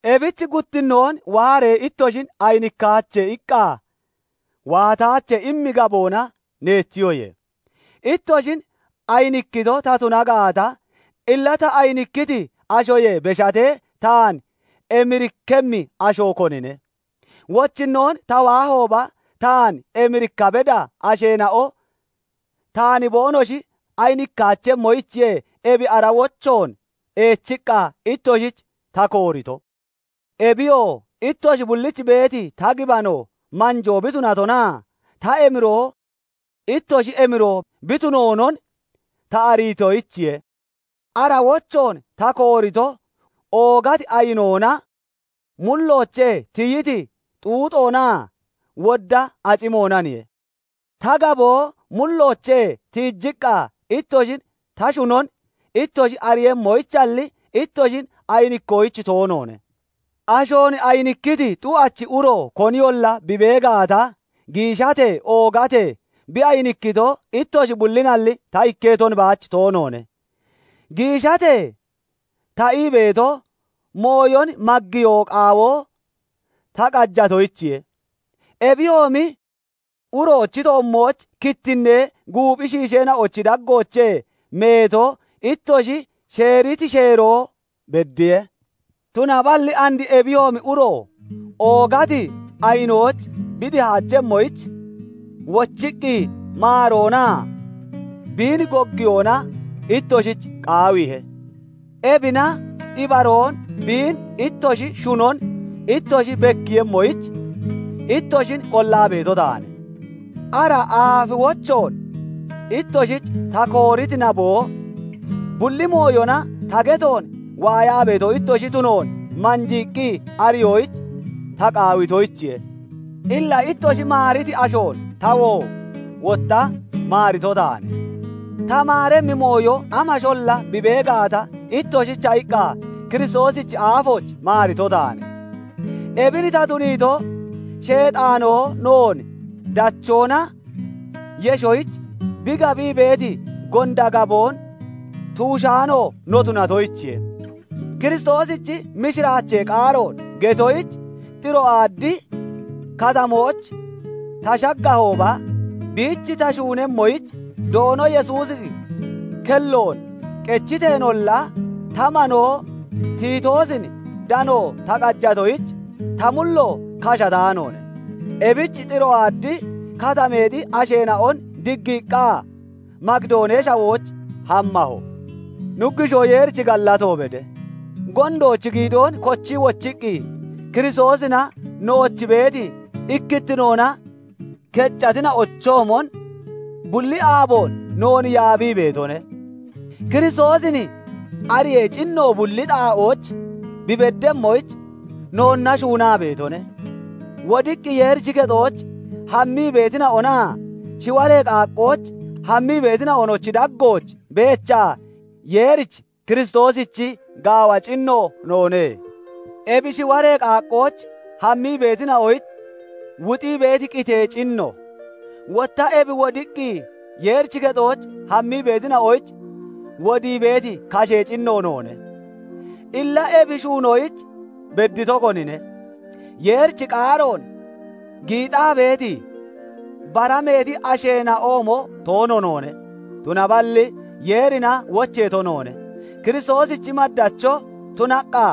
Ebich "Guttinnoon waaree ittoshin ayinikkaache" iqqa, "Waataache" immi gaboona neechiyoye. Ittoshin ayinikkito ta tuna gaata, illa ta ayinikkiti ashoyee beshatee, taan emirikkemmi asho konine? Wochinnoon ta waahooba, taan emirikka beda asheena'o taan boonoshi ayinikkaachemmoyichiye ebi ara wochoon eechiqqa ittoshich ta koorito; Ebiyoo, ittoshi bullich beeti ta gibano manjoo bi tunatonaa ta emiroo ittoshi emiroo bi tunoonon ta ariitoyichiye. Ara wochoon ta koorito, oogati ayinoona, mulloochee tiyiti xuuxoonaa wodda acimoonaniye; ta gaboo mulloochee tiijiqqa ittoshin ta shunon ittoshi ariiyemmoyichalli, ittoshin ayinikkoyich toonoone. Ashoon ayinikkiti xu'achi uro koniyolla bi bee gaata, giishatee oogatee bi ayinikkito ittoshi bullinalli, ta ikketon baach toonoone. Giishatee ta ii beeto, mooyon maggiyoo qaawo ta qajatoyichiye. Ebiyoomi uroochi toommooch kittinnee guuphi shiisheena'ochi daggoochee meeto ittoshi sheeriti sheeroo beddiye; tunaballi and ebiyoomi uro oogati ayinooch bi dihaachemmoyich, wochiqqi maaroonaa biin goggiyoona ittoshich qaawiihe. Ebina ibaroon biin ittoshi shunon ittoshi bekkiiyemmoyich, ittoshin qollaa beeto taane. Ara aafi wochoon ittoshich ta kooriti naboo, bulli mooyona ta getoon waayaa beeto ittoshi tunoon manjiiqqi ariyoyich ta qaawitoyichiye. Illa ittoshi maariti ashoon tawoo wotta maarito taane; ta maaremmi mooyo amasholla bi bee gaata, ittoshicha iqqa Kiristoosichi aafooch maarito taane. Ebin ta tuniito, Sheexaanoo noon dachoona yeshoyich bi gabii beeti gonda gaboon tuushaano no tunatoyichiye. Kiristoosichi mishiraachee qaaroon getoyich Xiroaadi Katamooch ta shaggahooba, biich ta shuunemmoyich Doono Yesuusi kelloon qechiteenolla, ta manoo Tiitoosin dano ta qajatoyich, ta mullo kashataanoone; ebich Xiroaadi Katameexi asheena'on diggiiqqa, Makidoonee Shawooch hammaho. Nuggushoo Yeerich gallato bede; gondoochi giidoon kochii wochiqqi Kiristoosina nooch beeti ikkittinoona keccatina'ochoomon bulli aaboon noon yaabii beetone; Kiristoosin ariyee cinno bulli xaa'ooch bi beddemmoyich noonna shuunaa beetone. Wodiqqi Yeerichi kexooch hammii beetina'onaa shiwaree qaaqqooch hammii beetina'onochi daggooch beechaa Yeerich Kiristoosichi gaawa cinno noone. Ebi shiwaree qaaqqooch hammii beetina'oyich wuxii beeti qitee cinno, wotta ebi wodiqqi Yeerichi kexooch hammii beetina'oyich wodii beeti kashee cinno noone. Illa ebi shuunoyich beddito konine? Yeerichi qaaroon giixaa beeti, bara meeti asheena'oomo toono noone; tunaballi Yeerina wocheeto noone; Kiristoosichi maddacho tunaqqa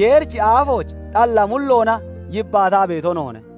Yeerichi aafooch xalla mulloona yibbaataa beeto noone.